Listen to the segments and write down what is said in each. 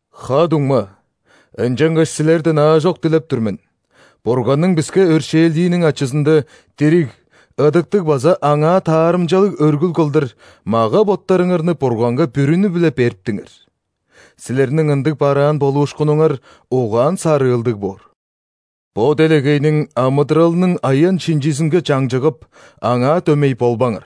Ха-дуңма, ынчангаш силерден аажок дилеп тур мен: Бурганның биске өршээлдииниң ачызында, дириг, ыдыктыг база Аңаа таарымчалыг өргүл кылдыр, мага-боттарыңарны Бурганга бүрүнү-биле бериптиңер. Силерниң ындыг бараан болуушкунуңар угаан-сарыылдыг боор. Бо делегейниң амыдыралының аян-шинчизинге чаңчыгып, аңаа дөмей болбаңар,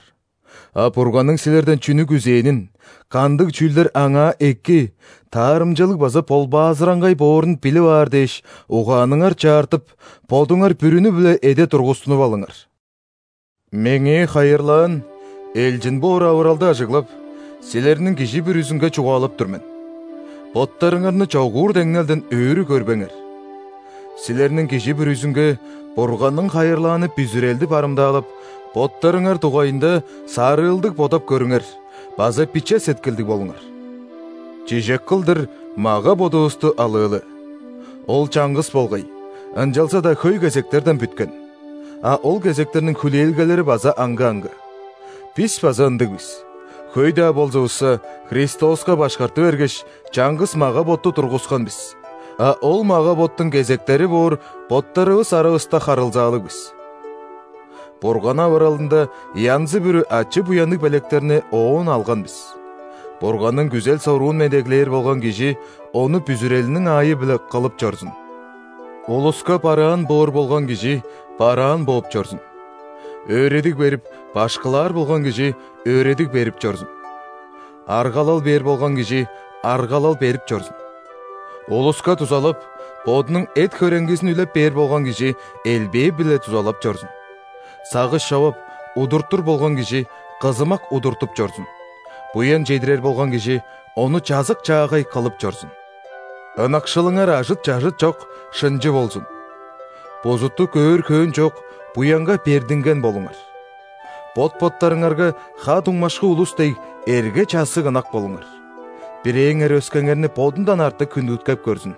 а Бурганның силерден чүнү күзээнин, кандыг чүүлдер Аңаа эки, таарымчалыг база ·болбаазыраңгай боорун билип аар дээш, угааныңар чаартып, бодуңар бүрүнү-биле эде тургустунуп алыңар. Меңээ хайырлаан элчин боор авыралды ажыглап, силерниң кижи бүрүзүнге чугаалап тур мен: боттарыңарны чогуур деңнелден өрү көрбеңер. Силерниң кижи бүрүзүнге Бурганның хайырлааны бүзүрелди барымдаалап, боттарыңар дугайында сарыылдыг бодап көрүңер база биче сеткилдиг болуңар. Чижек кылдыр мага-бодувусту алыылы: ол чаңгыс болгай, ынчалза-даа хөй кезектерден бүткен (а ол кезектерниң хүлээлгелери база аңгы-аңгы). Бис база ындыг бис: хөй-даа болзувусса, Христоска башкарты бергеш, чаңгыс мага-ботту тургускан бис, а ол мага-боттуң кезектери боор боттарывыс аравыста харылзаалыг бис. Бурган авыралында янзы-бүрү ачы-буянныг белектерни Оон алган бис: Бурганның күзел-соруун медеглээр болган кижи ону бүзүрелиниң аайы-биле кылып чорзун; улуска бараан боор болган кижи – бараан бооп чорзун; өөредиг берип, башкылаар болган кижи – өөредиг берип чорзун; аргалал бээр болган кижи – аргалал берип чорзун; улуска дузалап, бодунуң эт-хөреңгизин үлеп бээр болган кижи – элбээ-биле дузалап чорзун; сагыш човап, удуртур болган кижи – кызымак удуртуп чорзун; буян чедирер болган кижи – ону чазык-чаагай кылып чорзун. Ынакшылыңар ажыт-чажыт чок, шынчы болзун. Бузутту көөр хөөн чок, буянга бердинген болуңар. Бот-боттарыңарга, ха-дуңмашкы улус дег, эрге-чассыг ынак болуңар; бирээңер өскеңерни бодундан артык хүндүткеп көрзүн.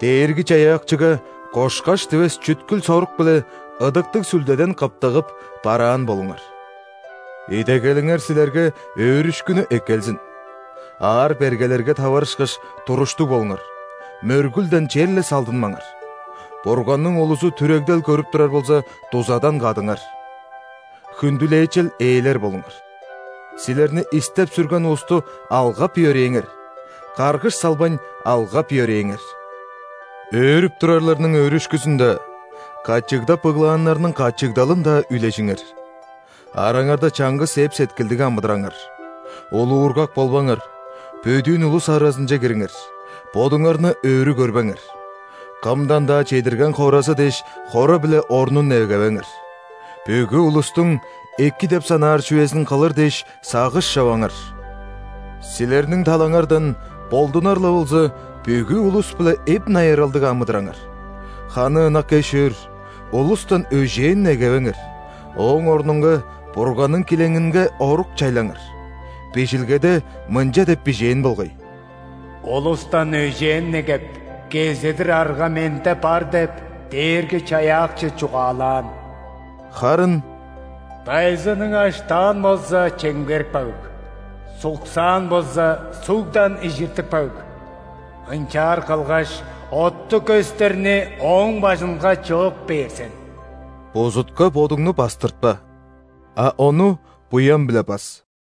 Дээрги-Чаяакчыга кошкаш дивес чүткүл-сорук-биле, Ыдыктыг Сүлдеден кыптыгып, бараан болуңар. Идегелиңер силерге өөрүшкүнү эккелзин, аар-бергелерге таварышкаш, туруштуг болуңар; мөргүлден черле салдынмаңар; Бурганның улузу түрегдел көрүп турар болза, дузадан кадыңар. Хүндүлээчел ээлер болуңар. Силерни истеп-сүрген улусту алгап-йөрээңер, каргыш салбайн, алгап-йөрээңер. Өөрүп турарларның өөрүшкүзүн-даа, качыгдап ыглааннарның качыгдалын-даа үлежиңер. Араңарда чаңгыс эп-сеткилдиг амыдыраңар. Улуургак болбаңар, бөдүүн улус аразынче кириңер, бодуңарны өрү көрбеңер. Кымдан-даа чедирген хоразы дээш хора-биле орнун негевеңер. Бүгү улустуң эки деп санаар чүвезин кылыр дээш сагыш човаңар. Силерниң талаңардан, болдунар-ла болза, бүгү улус-биле эп-найыралдыг амыдыраңар. Ханы ынак эш-өөр, улустан өжээн негевеңер, ооң орнунга Бурганның килеңинге орук чайлаңар. Бижилгеде мынча деп бижээн болгай: «„Улустан өжээн негеп, кезедир арга Менде бар“ – деп, Дээрги-Чаяакчы чугаалаан». Харын«Дайзының аштаан болза, чемгерип каг;суксаан болза, сугдан ижиртип каг.Ынчаар кылгаш, оттуг көстерни ооң бажынга чыып бээр сен». Бузутка бодуңну бастыртпа, а ону буян-биле бас.